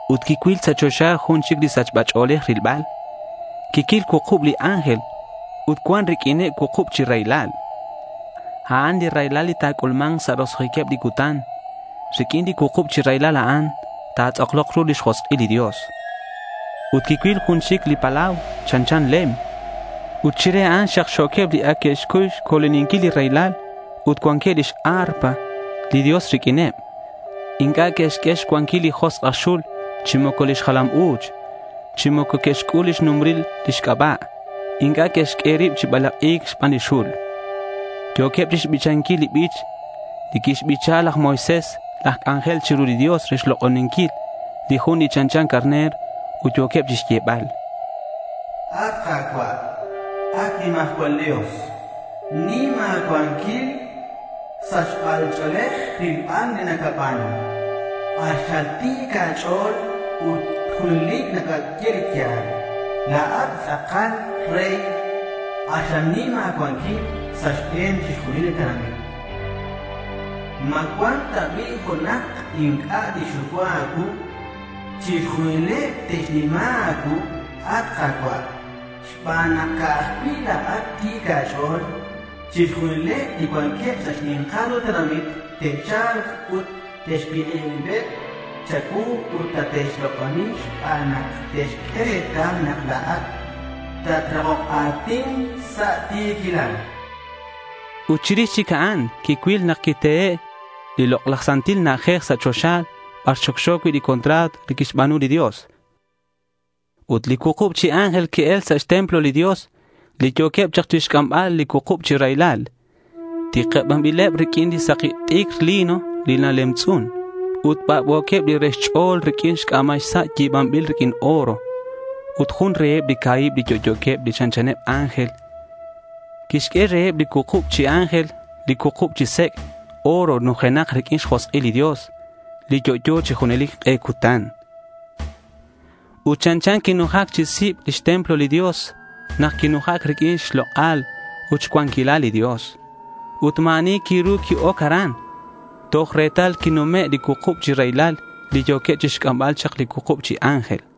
Ut quicuil sa' choxa jun chic li sachba ch'o̱lej rilbal. Quicuil cuukub li ángel ut cuan riq'uineb cuukub chi raylal. A'an li raylal li ta̱c'ulma̱nk sa' roso'jiqueb li cutan. Riq'uin li cuukub chi raylal a'an ta̱tz'aklok ru lix josk'il li Dios. Ut quicuil jun li palau chanchan lem yo̱ xxamlel. Ut chire a'an xakxo̱queb li ac que'xcuy xco̱loninquil li raylal ut cuanqueb lix arpa li Dios riq'uineb. Inc'a' que'xq'ue xcuanquil li josk' aj xul chi moco lix jalam u̱ch, chi moco que'xc'ul lix numbril lix c'aba'. Inc'a' que'xq'ue rib chi balak'i̱c xban li xul. Yo̱queb chixbichanquil li bich li quixbicha laj Moisés laj c'anjel chiru li Dios re xlok'oninquil li Jun li chanchan carner. Ut yo̱queb chixyebal: —At Ka̱cua', at nimajcual Dios, nim a̱cuanquil ut sachba ch'o̱lej rilbal li nacaba̱nu. K'axal ti̱c a̱ch'o̱l ut junelic nacaye li ya̱l. La̱at li tz'akal rey. K'axal nim a̱cuanquil sa' xbe̱neb chixjunileb li tenamit. ¿Ma cuan ta bi' junak inc'a' tixxucua a̱cuu? Chixjunileb te'xnima a̱cuu, at Ka̱cua', xban nak ca'aj cui' la̱at ti̱c a̱ch'o̱l. Chixjunileb li cuanqueb sa' li xni̱nkal ru tenamit te'cha̱lk ut te'xcuik'ib ribeb cha̱cuu ut tate'xlok'oni xban nak te'xq'ue retal nak la̱at tatrakok a̱tin sa' ti̱quilal.— Ut chirix chic a'an quicuil nak quitehe' li lok'laj santil na'ajej sa' choxa bar xocxo cui' li contrato li quixba̱nu li Dios. Ut li cuukub chi ángel que'el chak sa' xtemplo li Dios li yo̱queb chak chixc'ambal li cuukub chi raylal. Tikibanbileb riq'uin li saki t'icr lino li nalemtz'un. Ut bac'bo̱queb li re xch'o̱l riq'uin c'a̱mal sa' yi̱banbil riq'uin oro. Ut jun reheb li ca̱hib li yo'yo̱queb li chanchaneb ángel, quixq'ue reheb li cuukub chi ángel li cuukub chi sec' oro nujenak riq'uin xjosk'il li Dios, li yo'yo chi junelic k'e cutan. Ut chanchan quinujac chi sib lix templo li Dios nak quinujac riq'uin xlok'al ut xcuanquilal li Dios. Ut ma̱ ani quiru qui-oc aran toj retal quinume' li cuukub chi raylal li yo̱queb chixc'ambal chak li cuukub chi ángel.